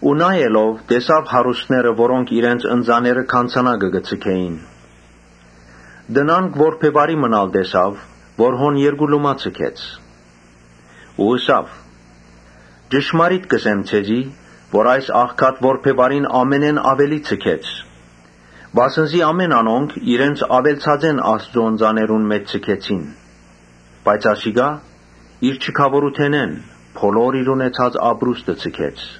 Յիսուս տեսաւ հարուստներ, որոնք իրենց ընծաները գանձանակը կը ձգէին։ Տնանկ որբեւարի մըն ալ տեսաւ, որ հոն երկու լումայ ձգեց։ Ըսաւ. «Ճշմարիտ կ’ըսեմ ձեզի, թէ այս աղքատ որբեւարին ամենէն աւելի ձգեց. Վասն զի անոնք իրենց աւելցածէն Աստուծոյ ընծաներուն մէջ ձգեցին, բայց ասիկա իր չքաւորութենէն իր բոլոր ունեցած ապրուստը ձգեց»։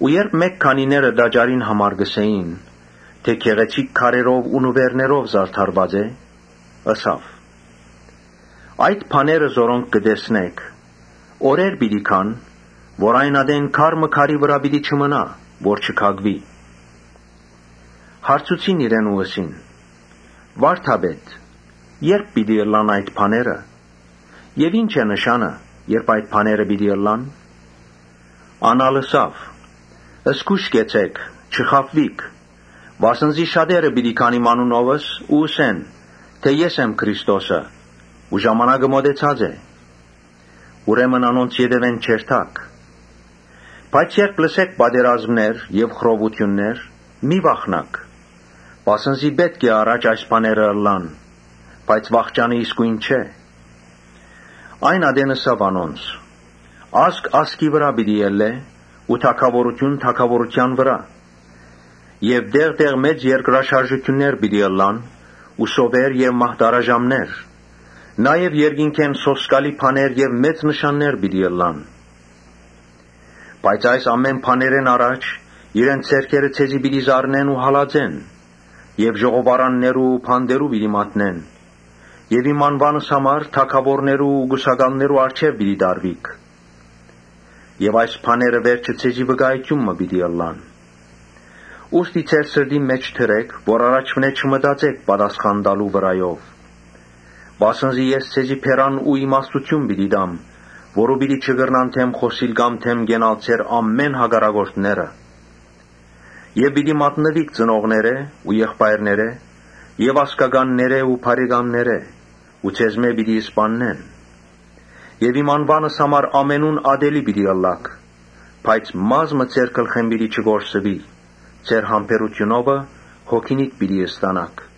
Երբ մէկ քանիները տաճարին համար կ’ըսէին թէ՝ ‘Գեղեցիկ քարերով ու նուէրներով զարդարուած է’, Ըսաւ. «Այդ բաները որոնք կը տեսնէք, օրեր պիտի գան երբ քար մը քարի վրայ պիտի չմնայ որ չքակուի»։ Հարցուցին իրեն ու ըսին. «Վա՛րդապետ, ե՞րբ պիտի ըլլան այդ բաները եւ ի՞նչ է նշանը՝ երբ այդ բաները պիտի ըլլան»։ Ան ալ ըսաւ. «Զգոյշ կեցէք, չխաբուիք, վասն զի շատերը պիտի գան իմ անունովս ու ըսեն թէ՝ ‘Ես եմ Քրիստոսը ու ժամանակը մօտեցած է’. ուստի անոնց ետեւէն մի երթաք։ Բայց երբ լսէք պատերազմներ եւ խռովութիւններ, մի՛ վախնաք, վասն զի պէտք է առաջ այդ բաները ըլլան, բայց վախճանը իսկոյն չէ»։ Այն ատեն ըսաւ անոնց. «Ազգ ազգի վրայ պիտի ելլէ ու թագաւորութիւն՝ թագաւորութեան վրայ. Եւ տեղ տեղ մեծ երկրաշարժներ պիտի ըլլան ու սովեր եւ մահտարաժամներ, նաեւ երկնքէն սոսկալի բաներ եւ մեծ նշաններ պիտի ըլլան։ Բայց այս բաներէն առաջ իրենց ձեռքերը ձեզի պիտի զարնեն ու հալածեն եւ ժողովարաններու ու բանտերու պիտի մատնեն եւ իմ անուանս համար թագաւորներու ու կուսակալներու առջեւ պիտի տարուիք։ Եւ այս բաները վերջը ձեզի վկայութիւն պիտի ըլլան։ Ուստի ձեր սրտին մէջ դրէք՝ որ առաջուընէ չմտածէք պատասխան տալու վրայով։ Վասն զի ես ձեզի բերան ու իմաստութիւն պիտի տամ, որուն պիտի չկրնան դէմ խօսիլ կամ դէմ կենալ ձեր բոլոր հակառակորդները։ Պիտի մատնուիք ծնողներէ ու եղբայրներէ եւ ազգականներէ ու բարեկամներէ ու ձեզմէ ոմանքը պիտի սպաննուին։ Իմ անուանս համար ամենուն ատելի պիտի ըլլաք. Բայց մազ մը ձեր գլխէն պիտի չկորսուի։ Ձեր համբերութիւնովը հոգինիդ պիտի փրկէք»։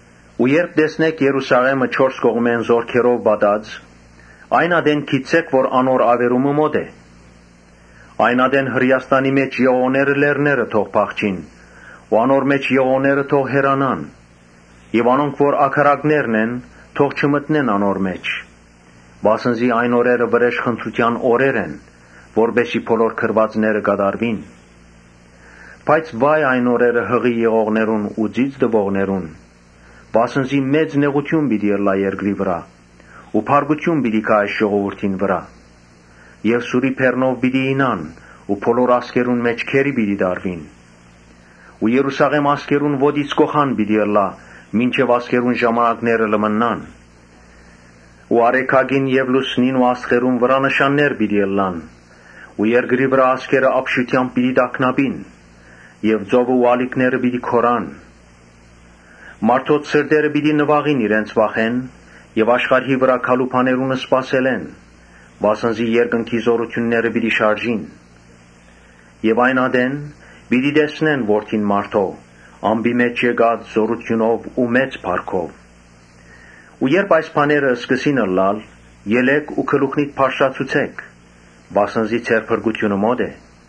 «Երբ տեսնէք Երուսաղէմը չորս կողմէն զօրքերով շրջապատուած, այն ատեն գիտցէք թէ անոր աւերումը մօտ է։ Այն ատեն Հրէաստանի մէջ եղողները լեռները թող փախչին ու անոր մէջ եղողները թող հեռանան եւ անոնք որ ագարակներն են՝ թող չմտնեն անոր մէջ։ Վասն զի այն օրերը՝ վրէժխնդրութեան օրեր են, որպէս զի բոլոր գրուածները կատարուին։ Բայց վա՜յ այն օրերը յղի եղողներուն ու ծիծ տուողներուն, վասն զի մեծ նեղութիւն պիտի ըլլայ երկրի վրայ ու բարկութիւն պիտի գայ այս ժողովուրդին վրայ։ Եւ սուրի բերնով պիտի իյնան ու բոլոր ազգերուն մէջ գերի պիտի տարուին ու Երուսաղէմ ազգերուն ոտքի կոխան պիտի ըլլայ, մինչեւ ազգերուն ժամանակները լմննան»։ «Արեգակին եւ լուսնին ու աստղերուն վրայ նշաններ պիտի ըլլան ու երկրի վրայ ազգերը ապշութեամբ պիտի տագնապին եւ ծովն ու ալիքները պիտի գոռան. Մարդոց սրտերը պիտի նուաղին իրենց վախէն եւ աշխարհի վրայ գալու բաներուն սպասելէն, վասն զի երկնքի զօրութիւնները պիտի շարժին։ Այն ատեն պիտի տեսնեն Որդին մարդոյ ամպի մէջ եկած զօրութիւնով ու մեծ փառքով։ Երբ այս բաները սկսին ըլլալ, ելէք ու գլուխնիդ բարձրացուցէք, վասն զի ձեր փրկութիւնը մօտ է»։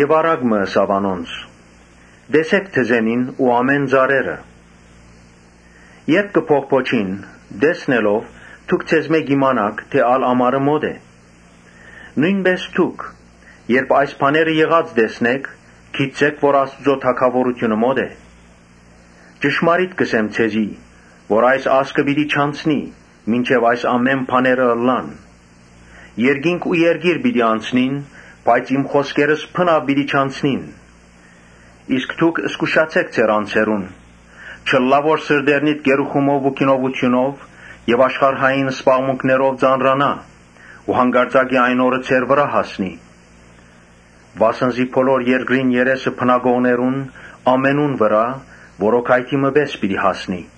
Առակ մը ըսաւ անոնց. «Տեսէք թզենին ու բոլոր ծառերը։ Երբ բողբոջին, տեսնելով՝ դուք ձեզմէ կ’իմանաք թէ ալ ամառը մօտ է։ Նոյնպէս դուք երբ այս բաները եղած տեսնէք, գիտցէք թէ Աստուծոյ թագաւորութիւնը մօտ է։ ‘Ճշմարիտ կ’ըսեմ ձեզի, թէ այս ազգը պիտի չանցնի, մինչեւ այս ամէն բաները ըլլան’։ Երկինք ու երկիր պիտի անցնին, բայց իմ խօսքերս բնաւ պիտի չանցնին»։ «Իսկ դուք զգուշացէք ձեր անձերուն, չըլլայ որ սրտերնիդ կերուխումով ու գինովութիւնով եւ աշխարհային զբաղմունքներով ծանրանայ ու յանկարծակի այն օրը ձեր վրայ հասնի. վասն զի բոլոր երկրին երեսը բնակողներուն ամենուն վրայ որոգայթի մը պէս պիտի հասնի։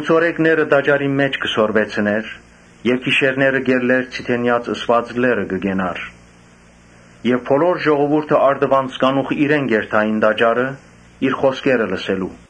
Յիսուս ցորեկները տաճարին մէջ կը սորվեցնէր. իսկ գիշերները կ’ելլէր Ձիթենեաց ըսուած լեռը կը կենար։ Բոլոր ժողովուրդը առտուն կանուխ իրեն կ’երթային տաժարը՝ իր խօսքերը լսելու։